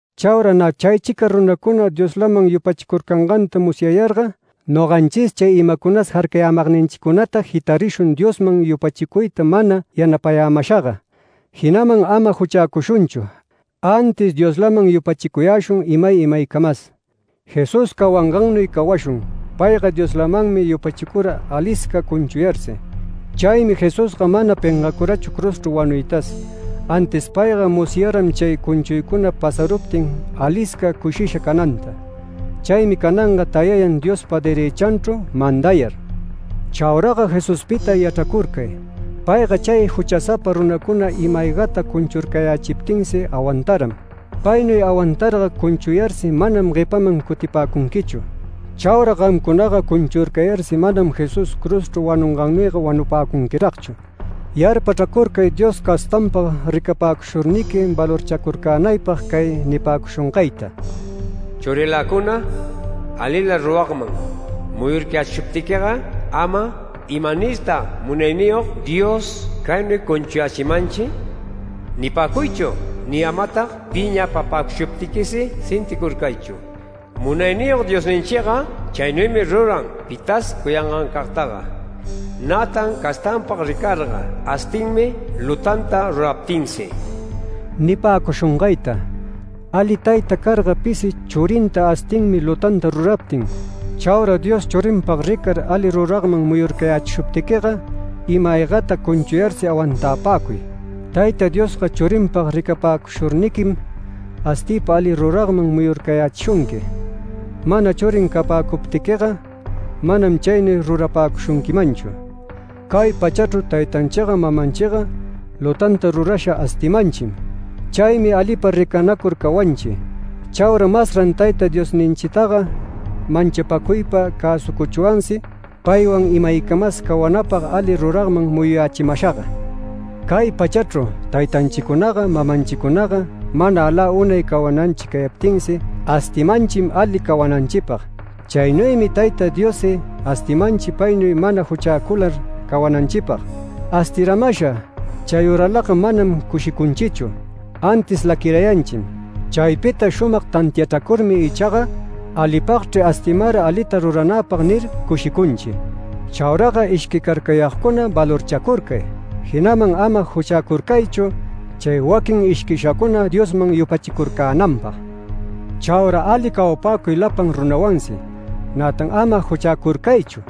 Chaura nä chaychica runacuna Dioslaman yupachicurcanganta musyayarga, noganchis chay imacunas jarcayämagninchicunata jitarishun Diosman yupachicuyta mana yanapayämashaga, jinaman ama juchäcushunchu, antis Dioslaman yupachicuyäshun imay imaycamas. Jesús cawangannuy cawashun, payga Dioslamanmi yupachicura alisca cunchuyarsi. Chaymi Jesusga mana pengacurachu cruzchru wanuytas, antis payga musyaram chay cunchuycuna pasaruptin alisca cushisha cananta. Chaymi cananga tayayan Diospa derëchanchru mandayar. Chauraga Jesuspita yachracurcay. Payga chay juchasapa runacuna ima-aygata cunchurcayächiptinsi awantaram. Paynuy awantarga cunchuyarsi manam guepaman cutipäcunquichu. Chaura gamcunaga cunchurcayarsi manam Jesús cruzchru wanungannuyga wanupäcunquiragchu. Yarpachracurcay Dios castanpag ricapäcushurniqui valorchacurcänaypag cay nipäcushungayta: “Churiläcuna alila ruragman muyurcayächiptïga ama ‘¿Imanirtag Munayniyog Dios caynuy cunchuyächimanchi?’ nipäcuychu ni amatag piñapapäcuptïsi sinticurcaychu. Munayniyog Diosninchiga chaynuymi ruran pitas cuyangancagtaga, nätan castanpag ricarga astinmi lutanta ruraptinsi” nipäcushungayta. Ali tayta carga pisi churinta astinmi lutanta ruraptin. Chaura Dios churinpag ricar ali ruragman muyurcayächishuptiquiga ima-aygata cunchuyarsi awantapäcuy. Tayta Diosga churinpag ricapäcushurniquim astiypa alita ruragman muyurcayächishunqui. Mana churin capäcuptiquiga, manam chaynuy rurapäcushunquimanchu. Cay pachachru taytanchiga mamanchiga lutanta rurasha astimanchim. Chaymi alipa ricanacur cawanchi. Chaura masran Tayta Diosninchitaga manchapäcuypa cäsucuchwansi paywan imaycamas cawanapag ali ruragman muyuyächimashaga. Cay pachachru taytanchicunaga mamanchicunaga mana alä unay cawananchi cayaptinsi astimanchim ali cawananchipag. Chaynuymi Tayta Diossi astimanchi paynuy mana juchäcular cawananchipag. Astiramasha chayüralaga manam cushicunchichu, antis laquirayanchim. Chaypita shumag tantiachräcurmi ichaga “Alipagchri astimara alita ruranäpag” nir cushicunchi. Chauraga ishquicarcayagcuna valorchacurcay. Jinaman ama juchäcurcaychu, chay waquin ishquishacuna Diosman yupachicurcänanpag. Chaura ali cawapäcuy lapan runawansi, nätan ama juchäcurcaychu.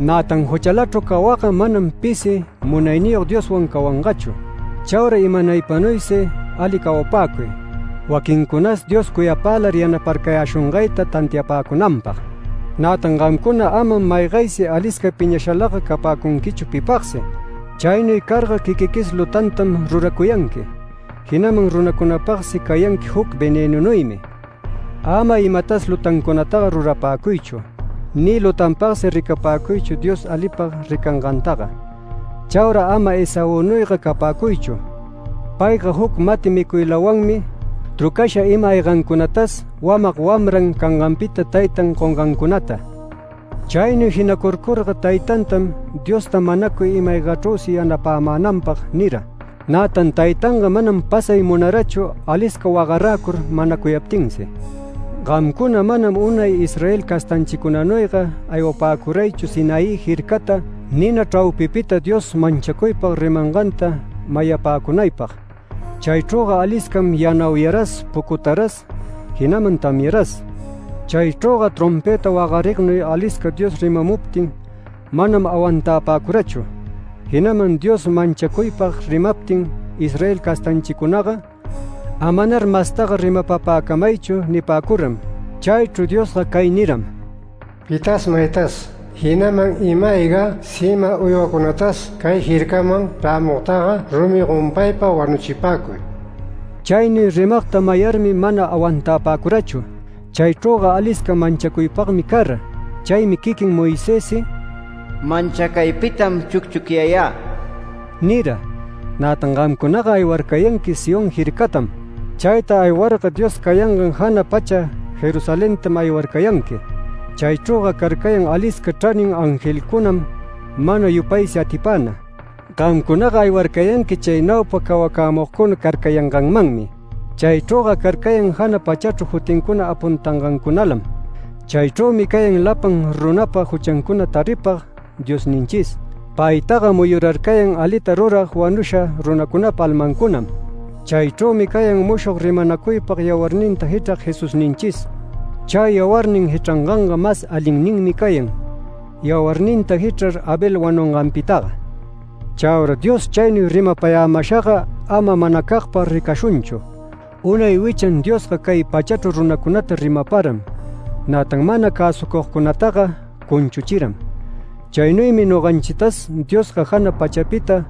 Nätan juchälachru cawagga manam pisi Munayniyog Dioswan cawangachu. Chaura imanaypanuysi ali cawapäcuy, waquincunas Dios cuyapälar yanaparcayäshungayta tantiapäcunanpag. Nätan gamcuna amam maygaysi alisca piñashalaga capäcunquichu pipagsi. Chaynuy carga quiquiquis lutantam ruracuyanqui, jinaman runacunapagsi cayanqui juc venënunuymi. Ama imatas lutancunataga rurapäcuychu, ni lutanpagsi ricapäcuychu Dios alipag ricangantaga. Chaura ama Esaünuyga capäcuychu. Payga juc mati micuylawanmi trucasha ima-aygancunatas, wamag wamran canganpita taytan gongancunata. Chaynuy jinacurcurga taytantam “Diosta manacuy ima-aygachrüsi yanapämänanpag” nira. Nätan taytanga manam pasay munarachu alisca wagaräcur manacuyaptinsi. Gamcuna manam unay Israel castanchicunanuyga aywapäcuraychu Sinaí jircata nina chraupipita Dios manchacuypag rimanganta mayapäcunaypag. Chaychrüga aliscam yanauyaras pucutaras, jinaman tamyaras. Chaychrüga trompëta wagarignuy alisca Dios rimamuptin manam awantapäcurachu, jinaman Dios manchacuypag rimaptin Israel castanchicunaga “Amanar mastaga rimapapäcamaychu” nipäcuram. Chaychru Diosga cay niram: “Pitas maytas, jinaman ima-ayga sima uywacunatas cay jircaman chrämugtaga rumi gompaypa wanuchipäcuy”. Chaynuy rimagta mayarmi mana awantapäcurachu. Chaychrüga alisca manchacuypagmi cara. Chaymi quiquin Moisessi “Manchacaypitam chucchucyayä” nira. Nätan gamcunaga aywarcayanqui Sión jircatam. Chayta aywarga Dios cayangan jana pacha Jerusalentam aywarcayanqui. Chaychrüga carcayan alisca chranin angelcunam mana yupaysi atipäna. Gamcunaga aywarcayanqui chay naupa cawacämugcuna carcayanganmanmi. Chaychrüga carcayan jana pachachru jutincuna apuntangancunalam. Chaychrümi cayan lapan runapa juchancuna taripag Diosninchis. Paytaga muyurarcayan alita rurag wanusha runacunapa almancunam. Chaychrümi cayan mushog rimanacuypag yawarninta jichrag Jesusninchis. Chay yawarnin jichranganga mas alinninmi cayan, yawarninta jichrar Abel wanunganpitaga. Chaura Dios chaynuy rimapayämashaga ama manacagpag ricashunchu. Unay wichan Diosga cay pachachru runacunata rimaparam. Nätan mana cäsucugcunataga cunchuchiram. Chaynuymi noganchitas Diosga jana pachapita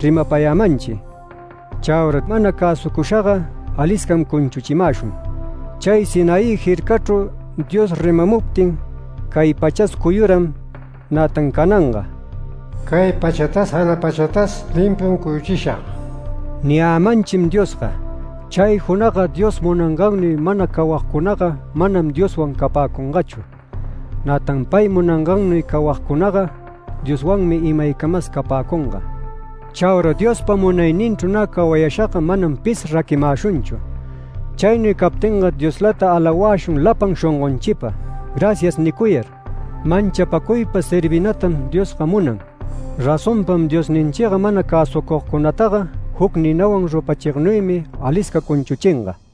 rimapayämanchi. Chaura mana cäsucushaga aliscam cunchuchimäshun. Chay Sinaí jircachru Dios rimamuptin cay pachas cuyuram. Nätan cananga “Cay pachatas jana pachatas limpum cuyuchishag” niyämanchim Diosga. Chay junagga Dios munangannuy mana cawagcunaga manam Dioswan capäcungachu. Nätan pay munangannuy cawagcunaga Dioswanmi imaycamas capäcunga. Chaura Diospa munayninchru nä cawashaga manam pis raquimäshunchu. Chaynuy captinga Dioslata alawäshun lapan shongonchipa. “Gracias” nicuyar, manchapacuypa servinatam Diosga munan. Razonpam Diosninchiga mana cäsucugcunataga juc ninawan rupachignuymi alisca cunchuchinga.